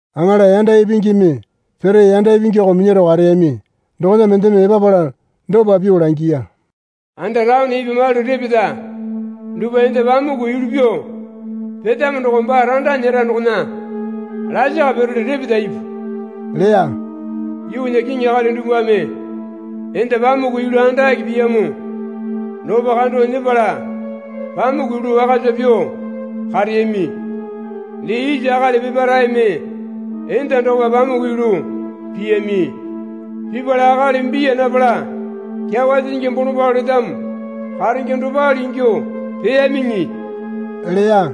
Aŋala yanda ipingimi pere yanda ipingyako minyaro kareyami dokona mendeme epapala dopa pyuo langiya. Anda taone ipwa malu repeta dupwa enda pamuku yulu pyuo petamo doko baa randa nyera dokona lasaka pirole repeta ipu leya. Yuunya kiŋi akali dupwame enda pamuku yulu andake piyamo dokopa kando nyepala pamuku yulu wakasa pyuo kareyami. Dee isa akali peparaeme enda dokopa pamuku yulu piyami. Pipala akali biya napala kyawa sisingi bolombalo letamo karenge dopale ingyuo peyamiŋi leya.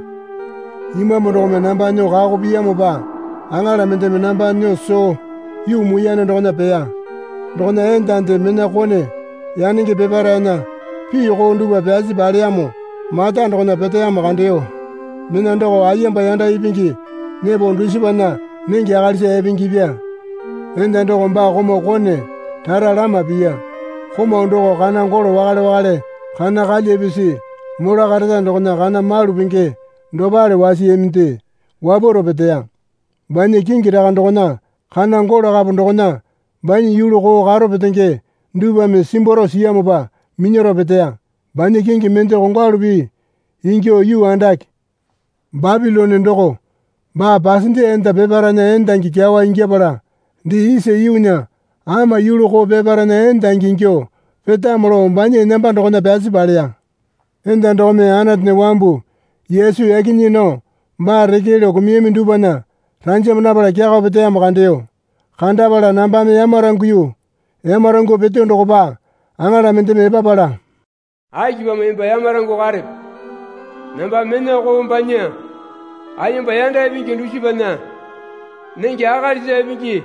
Imambu dokome namba nyuo kako piyamopa aŋala mendeme namba nyuo soo yuu muiyane dokona peya. Dokona endande mena kone yanenge peparaena pii koo dupwa pyasi paleyamo mata dokona peteyamo kandeyo. Mena doko ayemba yanda ipingi nyepo dusipana nenge akalisa epengepya. Enda doko baa komau kone rara lama piya. Komau doko kana golo wakale wakale kana kalya pisi mola kareta dokona kana malu penge dopale wasiyaminde wapwaro peteya. Banya kingi raka dokona kana golo kapo dokona banya yulu koo karo petenge dupwame simbwaro siyamopa minyaro peteya. Banya kingi mende kongwalu pii ingyuo yuu andake Bapilone doko baa pasende enda peparaena endangi kyawa ingyapala dee isa yuunya ama yulu koo peparaena endangi ingyuo petamo lao banya enamba dokona pyasi paleya. Enda dokome Anatunya wambu Yesu yaki nyii nao baa reke lao kumuyami dupwana ranjama napala kyakao peteyamo kandeyo. Kandapala nambame yamaranguyu. Yamarangyuo peteyo dokopa aŋala mendeme epapala, Akipamo emba yamarangyuo karepe? Nambame mena koo banya ayemba yanda ipingi dusipana nenge akalisa epenge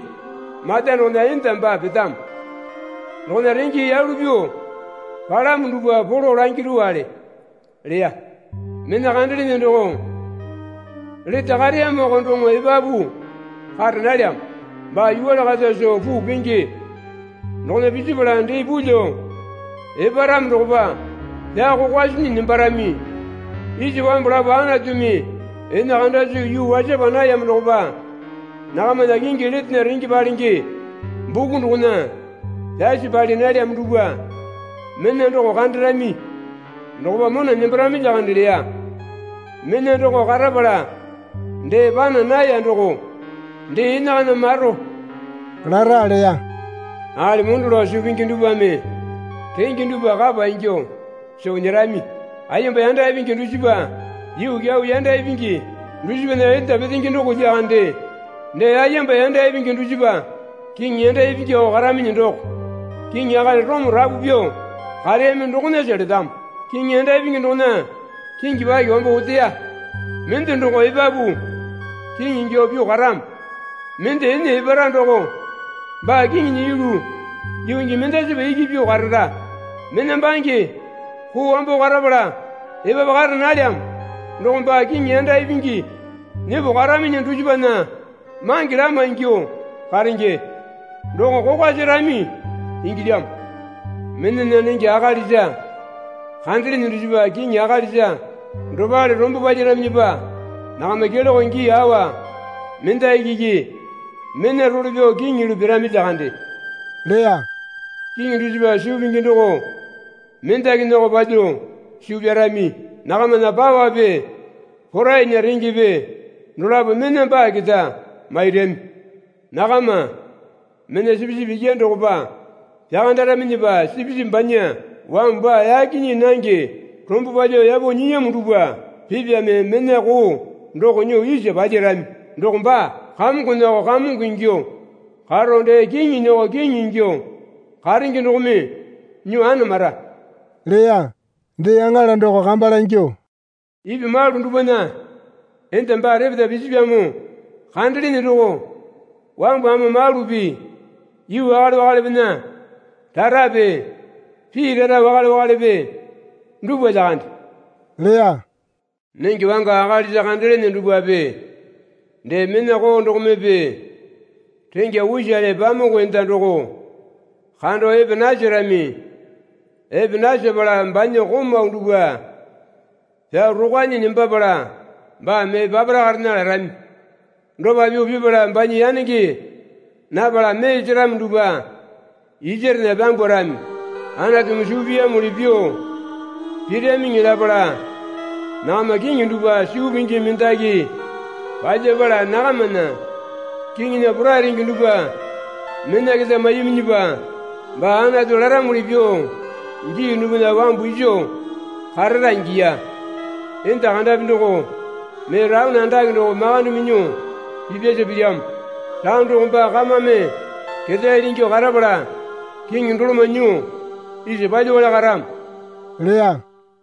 mata dokona enda baa petamo dokona renge yalu pyuo palamo dupwa polo langirowale leya. Mena kandelene doko lete kareyamoko doŋo epapu kara nalyamo. Baa yuwale kata soo puu penge dokona pisipala dee pulyuo eparamo dokopa pyao kokwa sinyi nembarami. Isa wambu lapo Anatumi ene kanda soo yuu wasapa nayamo dokopa nakamana kingi letena renge palenge buku dokona pyasi pali nalyamo dupwa mena doko kandarami dokopa mona nembarami lyakande leya. Mena doko karapala dee pana naya doko dee enakana maro lara leya. Akali mondo lao suu pingi dupwame renge dupwa kapa ingyuo soo nyerami. Ayemba yanda ipingi dusipa yuu kyau yanda ipingi dusipana enda petenge doko lyakande. Dee ayemba yanda ipingi dusipa kiŋi yanda ipingyako karaminyi doko. (Kiŋi akali Orome rapu pyuo kareyami dokonasa letamo.) Kiŋi yanda ipingi dokona kingi paki wambo oteya. Mende doko epapu kiŋi ingyuo pyuo karamo. Mende ene epara doko baa kiŋinya yulu yuu gii mendasipa iki pyuo karara. Mena bange koo wambo karapala epapu kara nalyamo doko baa kiŋi yanda ipingi nyepo karaminyi dusipana mange lama ingyuo karenge. Doko kokwa serami ingilyamo. Menana nenge akalisa kandelene dusipa kiŋi akalisa dopale rombo palyaraminyipa nakama keloke gii awa mendaki iki mena role pyao kiŋi yulu pirami lyakande leya. Kiŋi dusipa suu pingi doko mendakinyako palyuo suu pyarami. Nakamana pawape porainya rengepe dolapo mena baa keta mairami. Nakama mena Sipisipi Ikyane dokopa pyakandaraminyipa Sipisipi banya wambu baa yaki nyii nange rombo palyuo yapo nyiyamo dupwa pipame mena koo doko nyuo isa palyarami. Doko baa kamongonyako Kamongo ingyuo karo dee kiŋinyako Kiŋi ingyuo karenge dokome nyuo anamara leya. Dee aŋala doko kamba langyuo, Ipwa malu dupwana enda baa repeta pisipyamo kandelene doko wambu ama malupi yuu wakale wakalepena rarape pii rara wakale wakalepe dupwa lyakande leya. Nenge wanga akalisa kandelene dupwape dee mena koo dokomepe renga usale pamuku enda doko kando epe naserami. Epe nasepala banya komau dupwa pyao rokwanyi nembapala baa mee papara karena larami. Dopa pyuo pipala banya yanenge napala mee seramo dupwa isarena pyambwarami. Anatumi suu piyamuli pyuo piramiŋi lapala nakama kiŋi dupwa suu pingi mendaki palyapala nakamana kiŋinya porai renge dupwa mena keta maiyaminyipa baa Anatu laramuli pyuo gii dupwana wambu iso karara ingiya. Enda kandapi doko mee taone andake doko makande minyuo pipyasa pilyamo. Taone doko baa kamame ketaele ingyuo karapala kiŋi doloma nyuo isa palyuowale karamo leya.